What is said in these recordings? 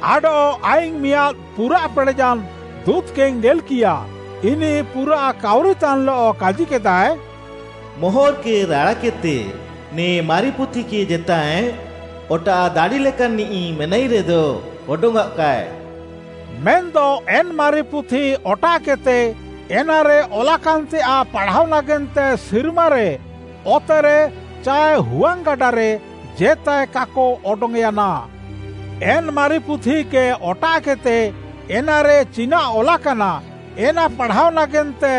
ଆଡଃ ଆଇଙ୍ଗ୍‌ ମିଆଁଦ୍‌ ପୁରାଃ ପେଡ଼େୟାନ୍‌ ଦୁଁତ୍‌କେଇଙ୍ଗ୍‌ ନେଲ୍‍କିୟା, ଇନିଃ ପୁରାଃ କାଉରିତାନ୍‌ଲଃ କାଜିକେଦାଏ, “ମୋହର୍‌କେ ରାଡ଼ାକେଦ୍‌ତେ, ନେ ମାରି ପୁଥିକେ ଜେତାଏ ଅଟାଃ ଦାଡ଼ି ଲେକାନ୍‌ନିଃ ମେନାଇରେଦ ଅଡଙ୍ଗ୍‌ଅଃକାଏ।” ମେନ୍‌ଦ ଏନ୍‌ ମାରି ପୁଥି ଅଟାଃକେଦ୍‌ତେ ଏନାରେ ଅଲାକାନ୍‌ତେୟାଃ ପାଢ଼ାଅ ନାଗେନ୍ତେ ସିର୍ମାରେ, ଅତେରେ ଚାଏ ହୁଆଙ୍ଗ୍‌ଗାଡ଼ାରେ ଜେତାଏ କାକ ଅଡଙ୍ଗ୍‌ୟାନା। ଏନ୍‌ ମାରି ପୁଥିକେ ଅଟାଃକେଦ୍‌ତେ ଏନାରେ ଚିନାଃ ଅଲାକାନା, ଏନା ପାଢ଼ାଅ ନାଗେନ୍ତେ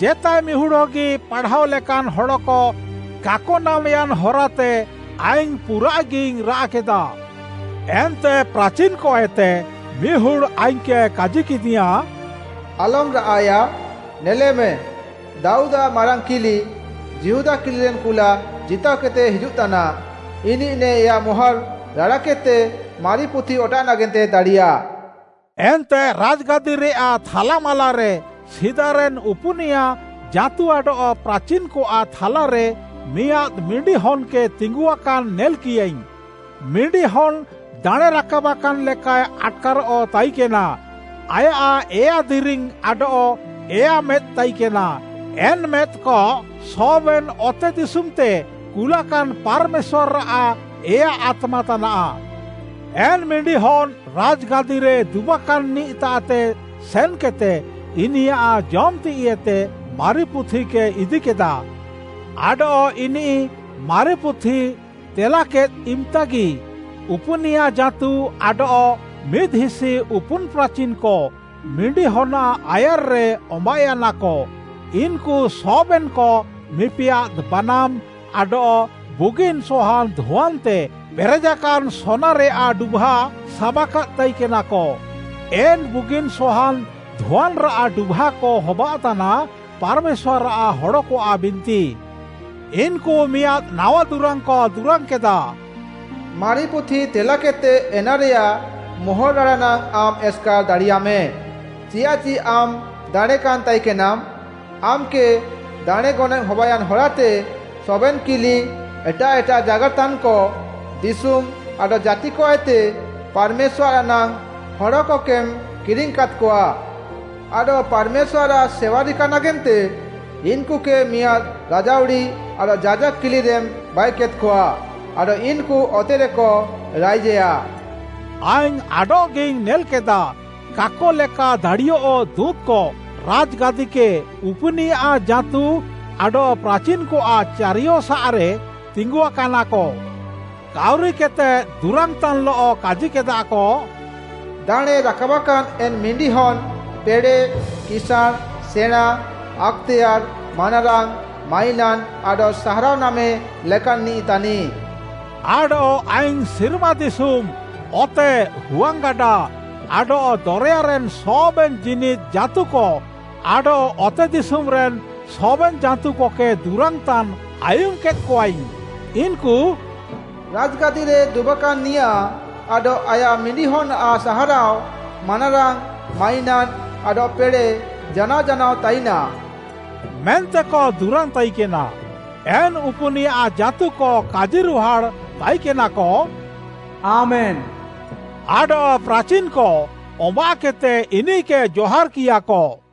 ଜେତାଏ ମିହୁଡ଼୍‌ ହଗି ପାଢ଼ାଏ ଲେକାନ୍‌ ହଡ଼କ କାକ ନାମ୍‌ୟାନ୍‌ ହରାତେ ଆଇଙ୍ଗ୍‌ ପୁରାଃଗିଇଙ୍ଗ୍‌ ରାଆଃକେଦା। ଏନ୍ତେ ପ୍ରାଚିନ୍‌କଏତେ ମିହୁଡ଼୍‌ ଆଇଙ୍ଗ୍‌କେ କାଜିକେଦିୟାଁ, “ଆଲମ୍‌ ରାଆଃଏୟା, ନେଲେମେ! ଦାଉଦ୍‌ଆଃ ମାରାଙ୍ଗ୍‌ କିଲି, ଯିହୁଦା କିଲିରେନ୍‌ କୁଲା ଜିତାଅକେଦ୍‌ତେ ହିଜୁଃତାନା, ଇନିଃ ନେ ଏୟା ମୋହର୍‌ ରାଡ଼ାକେଦ୍‌ତେ ମାରି ପୁଥି ଅଟାଃ ନାଗେନ୍ତେ ଦାଡ଼ିୟା।” ଏନ୍ତେ ରାଜ୍‌ଗାଦିରେୟାଃ ଥାଲାମାଲାରେ ସିଦାରେନ୍‌ ଉପୁନିୟା ଜାଁତୁ ଆଡଃ ପ୍ରାଚିନ୍‌କଆଃ ଥାଲାରେ ମିଆଁଦ୍‌ ମିଣ୍ଡିହନ୍‌କେ ତିଙ୍ଗୁଆକାନ୍‌ ନେଲ୍‌କିୟାଇଙ୍ଗ୍‌। ମିଣ୍ଡିହନ୍‌ ଦାଣେଁରାକାବ୍‌କାନ୍‌ ଲେକାଏ ଆଟ୍‌କାରଃ ତାଇକେନା। ଆୟାଃ ଏୟା ଦିରିଙ୍ଗ୍‌ ଆଡଃ ଏୟା ମେଦ୍‌ ତାଇକେନା। ଏନ୍‌ ମେଦ୍‌କ ସବେନ୍‌ ଅତେଦିଶୁମ୍‌ତେ କୁଲାକାନ୍‌ ପାର୍‌ମେଶ୍ୱାର୍‌ଆଃ ଏୟା ଆତ୍ମା ତାନାଃ। ଏନ୍‌ ମିଣ୍ଡିହନ୍‌ ରାଜ୍‌ଗାଦିରେ ଦୁବାକାନ୍‌ନିଃତାଃତେ ସେନ୍‌କେଦ୍‌ତେ, ଇନିୟାଃ ଜମ୍‌ ତିଃଇଏତେ ମାରି ପୁଥିକେ ଇଦିକେଦା। ଆଡଃ ଇନିଃ ମାରି ପୁଥି ତେଲାକେଦ୍‌ ଇମ୍‌ତାଗି, ଉପୁନିୟା ଜାଁତୁ ଆଡଃ ମିଦ୍‌ହିସି ଉପୁନ୍‌ ପ୍ରାଚିନ୍‌କ ମିଣ୍ଡିହନ୍‌ଆଃ ଆୟାର୍‌ରେ ଅମ୍ବାଃୟାନାକ। ଇନ୍‌କୁ ସବେନ୍‌କ ମିପିଆଦ୍‌ ବାନାମ୍‌, ଆଡଃ ବୁଗିନ୍‌ ସହାନ୍‌ ଧୁଆନ୍‌ତେ ପେରେଜାକାନ୍‌ ସୋନାରେୟାଃ ଡୁଭା ସାବାକାଦ୍‌ ତାଇକେନାକ। ଏନ୍‌ ବୁଗିନ୍‌ ସହାନ୍‌ ଧୁଆନ୍‌ରାଃ ଡୁଭାକ ହବାଅଃତାନା, ପାର୍‌ମେଶ୍ୱାର୍‌ଆଃ ହଡ଼କଆଃ ବିନ୍ତି। ଇନ୍‌କୁ ମିଆଁଦ୍‌ ନାୱା ଦୁରାଙ୍ଗ୍‌କ ଦୁରାଙ୍ଗ୍‌କେଦା, “ମାରି ପୁଥି ତେଲାକେଦ୍‌ତେ ଏନାରେୟାଃ ମୋହର୍‌ ରାଡ଼ା ନାଙ୍ଗ୍‌ ଆମ୍‌ ଏସ୍‌କାର୍‌ ଦାଡ଼ିୟାମେ। ଚିୟାଃଚି ଆମ୍‌ ଦାଣେଁକାନ୍‌ ତାଇକେନାମ୍‌, ଆମ୍‌କେ ଦାଣେଁ ଗନଏଃ ହବାୟାନ୍‌ ହରାତେ ସବେନ୍‌ କିଲି, ଏଟାଃ ଏଟାଃ ଜାଗାର୍‌ତାନ୍‌କ, ଦିଶୁମ୍‌ ଆଡଃ ଜାତିକଏତେ ପାର୍‌ମେଶ୍ୱାର୍‌ଆଃ ନାଙ୍ଗ୍‌ ହଡ଼କକେମ୍‌ କିରିଙ୍ଗ୍‌କାଦ୍‌କଆ। ଆଡଃ ପାର୍‌ମେଶ୍ୱାର୍‌ଆଃ ସେୱା ରିକା ନାଗେନ୍ତେ ଇନ୍‌କୁକେ ମିଆଁଦ୍‌ ରାଜାଉଡ଼ି ଆଡଃ ଯାଜାକ୍‌ କିଲିରେମ୍‌ ବାଇକେଦ୍‌କଆ ଆଡଃ ଇନ୍‌କୁ ଅତେରେକ ରାଇଜେୟା।” ଆଇଙ୍ଗ୍‌ ଆଡଃଗିଇଙ୍ଗ୍‌ ନେଲ୍‌କେଦା, କାକ ଲେକା ଦାଡ଼ିୟଃ ଦୁଁତ୍‌କ ରାଜ୍‌ଗାଦିକେ, ଉପୁନିୟା ଜାଁତୁ ଆଡଃ ପ୍ରାଚିନ୍‌କଆଃ ଚାରିୟସାଃରେ ତିଙ୍ଗୁଆକାନାକ। କାଉରିକେଦ୍‌ତେ ଦୁରାଙ୍ଗ୍‌ତାନ୍‌ଲଃ କାଜିକେଦାକ, “ଦାଣେଁ ରାକାବାକାନ୍‌ ଏନ୍‌ ମିଣ୍ଡିହନ୍‌ ପେଡ଼େଃ, କିସାଁଣ୍‌, ସେଣାଁ, ଆକ୍‌ତେୟାର୍‌, ମାନାରାଙ୍ଗ୍‌, ମାଇନାନ୍‌ ଆଡଃ ସାହାରାଅ ନାମେ ଲେକାନ୍‌ନିଃ ତାନିଃ।” ଆଡଃ ଆଇଙ୍ଗ୍‌ ସିର୍ମା ଦିଶୁମ୍‌, ଅତେ, ହୁଆଙ୍ଗ୍‌ଗାଡ଼ା ଆଡଃ ଦରେୟାରେନ୍‌ ସବେନ୍‌ ଜୀନିଦ୍‌ ଜାଁତୁକ ଆଡଃ ଅତେଦିଶୁମ୍‌ରେନ୍‌ ସବେନ୍‌ ଜାଁତୁକକେ ଦୁରାଙ୍ଗ୍‌ତାନ୍‌ ଆୟୁମ୍‌କେଦ୍‌କଆଇଙ୍ଗ୍‌। ଇନ୍‌କୁ “ରାଜ୍‌ଗାଦିରେ ଦୁବାକାନ୍‌ନିୟାଃ ଆଡଃ ଆୟାଃ ମିଣ୍ଡିହନ୍‌ଆଃ ସାହାରାଅ, ମାନାରାଙ୍ଗ୍‌, ମାଇନାନ୍‌ ଆଡଃ ପେଡ଼େଃ ଜାନାଅ ଜାନାଅ ତାଇନାଃ!” ମେନ୍ତେକ ଦୁରାଙ୍ଗ୍‌ ତାଇକେନା। ଏନ୍‌ ଉପୁନିୟା ଜାଁତୁକ କାଜିରୁହାଡ଼୍‌ ତାଇକେନାକ, “ଆମେନ୍‌!” ଆଡଃ ପ୍ରାଚିନ୍‌କ ଅମ୍ବାଃକେଦ୍‌ତେ ଇନିଃକେ ଜହାର୍‌କିୟାକ।